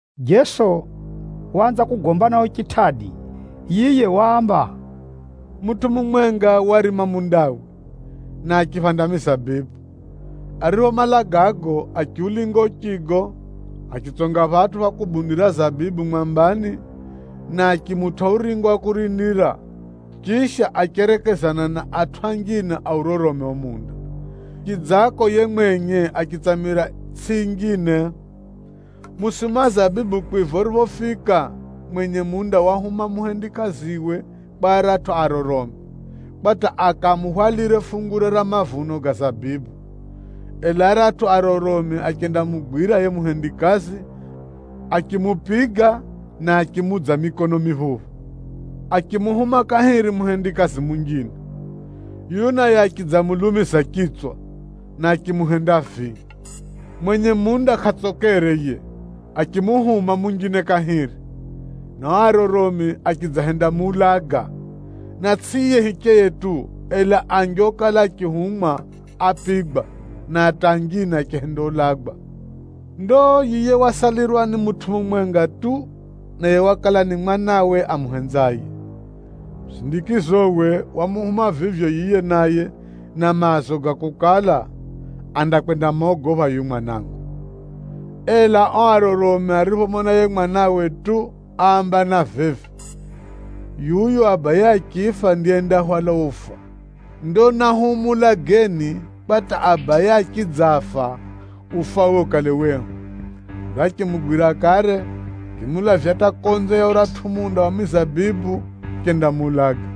Jeso waanza kugomba nao chitʼadi. Yiye waamba, “Mutʼu mumwenga warima mundawe, na achiphanda mizabibu. Ariphomala gago, achiulinga uchigo, achitsonga phatʼu pha kubundira zabibu mwambani, na achimutʼa uringo wa kurindira. Chisha, acherekezana na atʼu anjine aurorome uo munda, chidzako yiye mwenye achitsamira itsʼi yinjine. Musimu wa zabibu kwiva uriphofika, mwenye munda wahuma muhendikaziwe kwa aratʼu aroromi, kwa hata akamuhwalire fungure ra mavuno ga zabibu. Ela aratʼu aroromi achendamugwira yiye muhendikazi, achimupiga, na achimuudza mikono miphuphu. Achimuhuma kahiri muhendikazi munjine. Yuyu naye achidzamulumiza chitswa, na achimuhenda vii. Mwenye munda kʼatsokere yiye, achimuhuma munjine kahiri, na ao aroromi achidzahendamuulaga. Na tsʼi yiye hicheye tu, ela anji okala achihumwa ápigwa, na hata anjine achihendaulagwa. Ndo yiye wasalirwa ni mutʼu mumwenga tu, naye wakala ni mwanawe amuhenzaye. Musindikizowe, wamuhuma vivyo yiye naye na maazo ga kukala, ‘Andakwendamogopha yuyu mwanangu.’ Ela ao aroromi ariphomona yiye mwanawe tu, áambana vivi, ‘Yuyu abaye achifa ndiye yendahwala ufa. Ndo nahumuulageni kwa hata abaye achidzafa, ufawe ukale wehu!’ Ndo achimugwira kare, achimulavya hata konze ya uratʼu munda wa mizabibu, achendamuulaga.”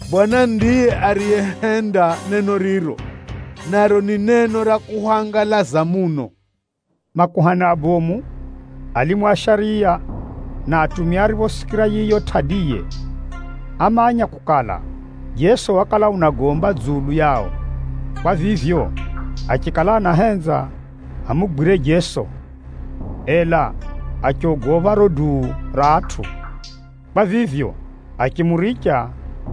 Bwana Mulungu ndiye ariyehenda neno riro, naro ni neno ra kuhwangalaza muno’?” Makuhani abomu, alimu a shariya na atumia ariphosikira yiyo tʼadiye, ámanya kukala, Jeso wakala unagomba dzulu yao. Kwa vivyo, achikala anahenza amugwire Jeso, ela achogopha riro duu ra atʼu. Kwa vivyo, achimuricha,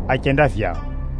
achenda vyao.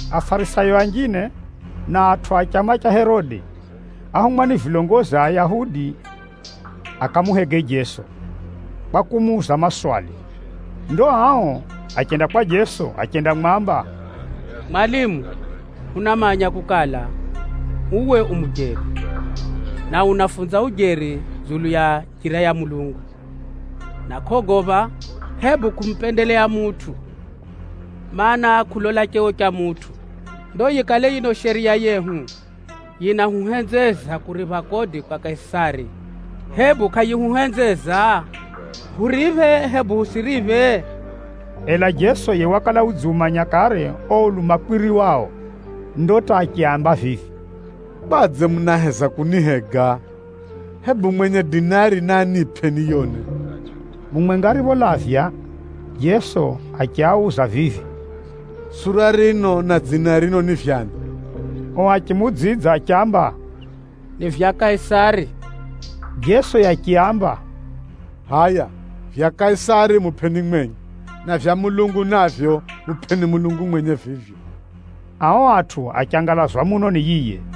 Afarisayo anjine, na atʼu a chama cha Herode áhumwa ni vilongozi a Ayahudi akamuhege Jeso, kwa kumuuza maswali. Ndo ao achenda kwa Jeso achendamwamba, “Mwalimu, hunamanya kukala, uwe u mujeri, na unafunza ujeri dzulu ya njira ya Mulungu, na kʼogopha, hebu kumupendeleya mutʼu, mana, kʼulola cheo cha mutʼu. Ndo yikale yino Shariya yehu, yinahuhenzeza kuripha kodi kwa Kaisari, hebu kʼayihuhenzeza? Huriphe, hebu hutsʼiriphe?” Ela Jeso yiye wakala udziumanya kare uo ulumakwiri wao. Ndo hata achiaamba vivi, “Kwadze munaheza kunihega? Hebu mwenye dinari Dinari yakala ni pʼesa ya Chirumi. naanipʼe niyone.” Mumwenga aripholavya, Jeso achiauza vivi, “Sura rino, na dzina rino ni vya ani?” Ao achimuudzidza achiamba, “Ni vya Kaisari.” Jeso yiye achiaamba, “Hʼaya vyakwe Kaisari mupʼeni mwenye, na vyakwe Mulungu navyo, mupʼeni Mulungu mwenye vivyo.” Ao atʼu achangalazwa muno ni yiye.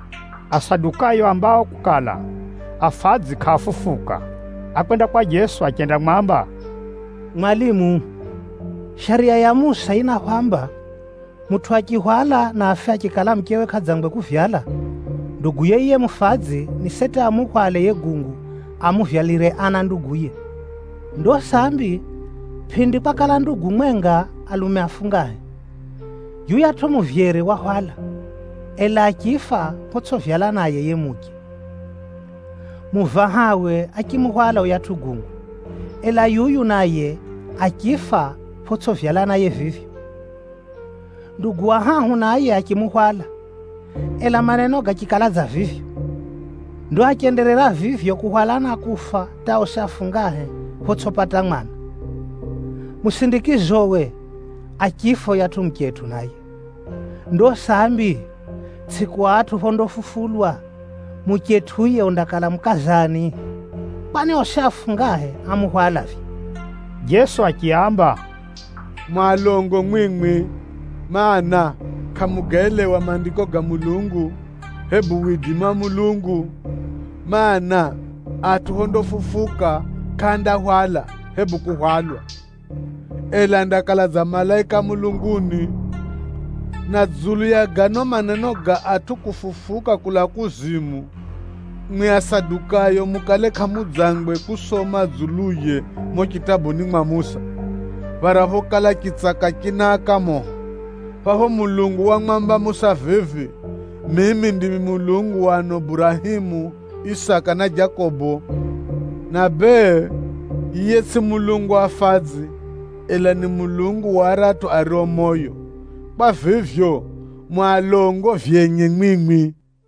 Asadukayo aambao kukala, afadzi kʼaafufuka, ákwenda kwa Jeso achendamwamba, “Mwalimu, Shariya ya Musa yinahwamba, ‘Mutʼu achihwala na afe achikala muchewe kʼadzangwe kuvyala, nduguye yiye mufadzi ni seti amuhwale yiye gungu amuvyalire ana nduguye.’ Ndo sambi, pʼindi kwakala ndugu mwenga, alume afungahe. Yuyatʼu muvyere wahwala, ela achifa photsʼivyala naye yiye muche. Muvahawe achimuhwala yuyatʼu gungu, ela yuyu naye achifa photsʼivyala naye vivyo. Nduguye wa hahu naye achimuhwala, ela maneno gachikala dza vivyo. Ndo achenderera vivyo kuhwala na kufa hata osi afungahe, photsʼipata mwana. Musindikizowe, achifa yuyatʼu muchetʼu naye. Ndo sambi, tsʼiku atʼu phondafufulwa, muchetʼu yiye undakala mukaza ani? Kwani osi afungahe ámuhwala vivyo!” Jeso achiaamba, “Mu alongo mwimwi, mana, kʼamugaelewa Maandiko ga Mulungu, hebu widimi wa Mulungu. Maana, atʼu phondafufuka, kʼaandahwala hebu kuhwalwa, ela andakala dza malaika a mulunguni. Na dzulu ya gano maneno ga atʼu kufufuka kulaa kuzimu, mwimwi Asadukayo mukale kʼamudzangwe kusoma dzuluye mumo chitabuni mwa Musa, phara phokala chitsaka chinaaka moho? Phapho Mulungu wamwamba Musa vivi, ‘Mimi ndimi Mulungu wa ano Burahemu, Isaka na Jakobo.’ Na bee, yiye tsʼiye Mulungu wa afadzi, ela ni Mulungu wa aratʼu ario moyo. Kwa vivyo, mu alongo vyenye mwimwi.”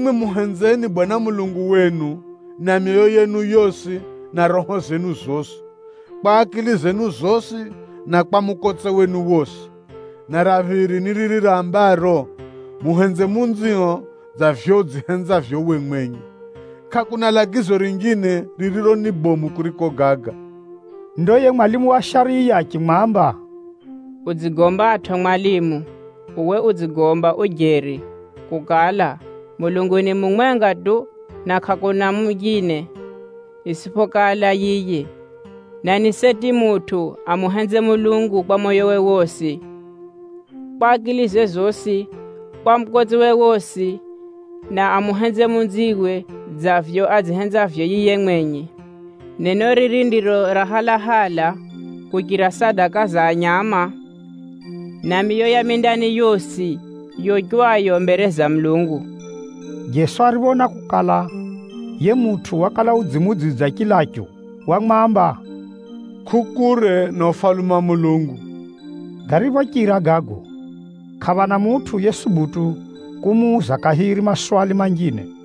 Muhenzeni Mwenyezi Mulungu, Mulungu wenu na moyo wenu wosi na roho renu rosi, kwa akili zenu zosi, na kwa mukotse wenu wosi!’ Na ra phiri ni riri rambaro, ‘Muhenze jiranio dza vivyo udzihenzavyo uwe mwenye.’ Kʼakuna lagizo rinjine, ririro ni bomu kuriko gaga.” Ndo yiye mwalimu wa shariya achimwamba, “Udzigombatʼo mwalimu! Uwe udzigomba ujeri kukala, Mulungu ni mumwenga tu, na kʼakuna munjine, itsʼiphokala yiye. Na ni seti mutʼu amuhenze Mulungu na moyowe wosi, na akilize zosi, na mukotsewe wosi, na amuhenze jiraniwe dza vivyo adzihenzavyo yiye mwenye. Neno riri ndiro ra halahala kuchira sadaka za nyama, na miyo ya mindani yosi yochwayo mbere za Mulungu.” Jeso ariphoona kukala, yiye mutʼu wakala udzimuudzidza chilachu, wamwamba, “Kʼu kure na Ufalume wa Mulungu.” Gariphochira gago, kʼaphana mutʼu yesubutu kumuuza kahiri maswali manjine.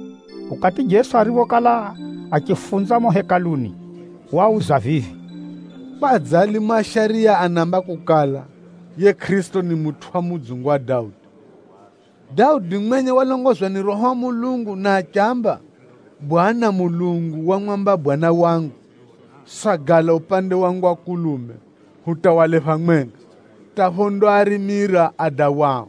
Ukati Jeso ariphokala achifunza mumo Hekaluni, wauza vivi, “Kwadze alimu a shariya anaamba kukala, ‘Yiye Kʼirisito ni mutʼu wa mudzungu wa Daudi’? Daudi mwenye walongozwa ni Roho wa Mulungu na achiamba, ‘Bwana Mulungu wamwamba Bwana wangu: “Sagala upande wangu wa mukono wa kulume, hata phondakuhenda warime tsetsetse adawao.” ’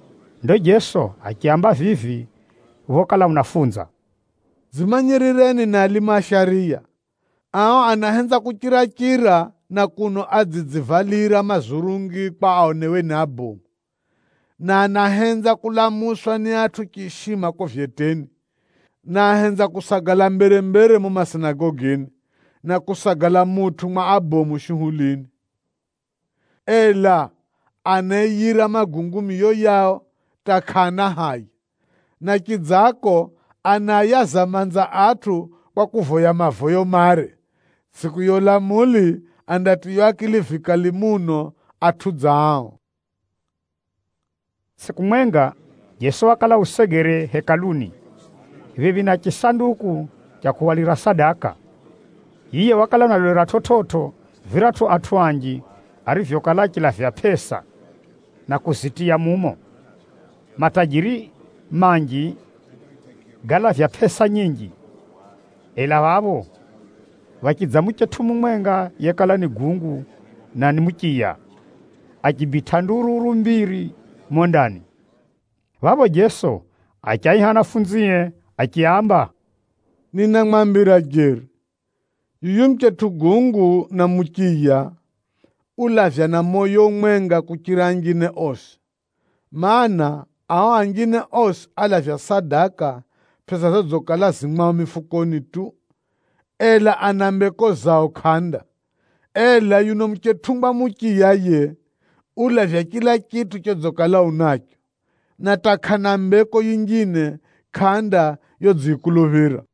Ndo Jeso achiaamba vivi phokala unafunza, “Dzimanyirireni na alimu a shariya. Ao anahenza kuchira-chira na kuno adzidzivalira mazurungi mare kwa aonewe ni abomu, na anahenza kulamuswa ni atʼu chiishima kuko vyeteni. Na ahenza kusagala mbere-mbere mumo masinagogini, na kusagala mutʼu mwa abomu shuhulini. Ela anaaiyira magungu miyo yao hata kʼaana haya, na chidzako anaayaza manza atʼu kwa kuvoya mavoyo mare. Tsʼiku ya ulamuli, andatiywa akili vikali muno atʼu dza ao!” Tsʼiku mwenga, Jeso wakala usegere Hekaluni, phephi na chisanduku cha kuhwalira sadaka. Yiye wakala unalolera chividzo viratʼu atʼu anji arivyokala achilavya pʼesa, na kuzitiya mumo. Matajiri manji gálavya pʼesa nyinji. Ela phapho phachidza muchetʼu mumwenga yekala ni gungu na ni muchiya, achibitʼa ndururu mbiri mumo ndani. Phapho Jeso achiaiha anafunzie achiaamba, “Ninamwambira jeri, yuyu muchetʼu gungu na muchiya, ulavya na moyo umwenga kuchira anjine osi. Maana, ao anjine osi alavya sadaka pʼesa zodzikala zirizo mwao mifukoni tu, ela ana mbeko zao kʼanda. Ela yuno muchetʼungwa muchiya yiye, ulavya chila chitʼu chodzikala unacho, na hata kʼana mbeko yinjine kʼanda yodziyikuluphira.”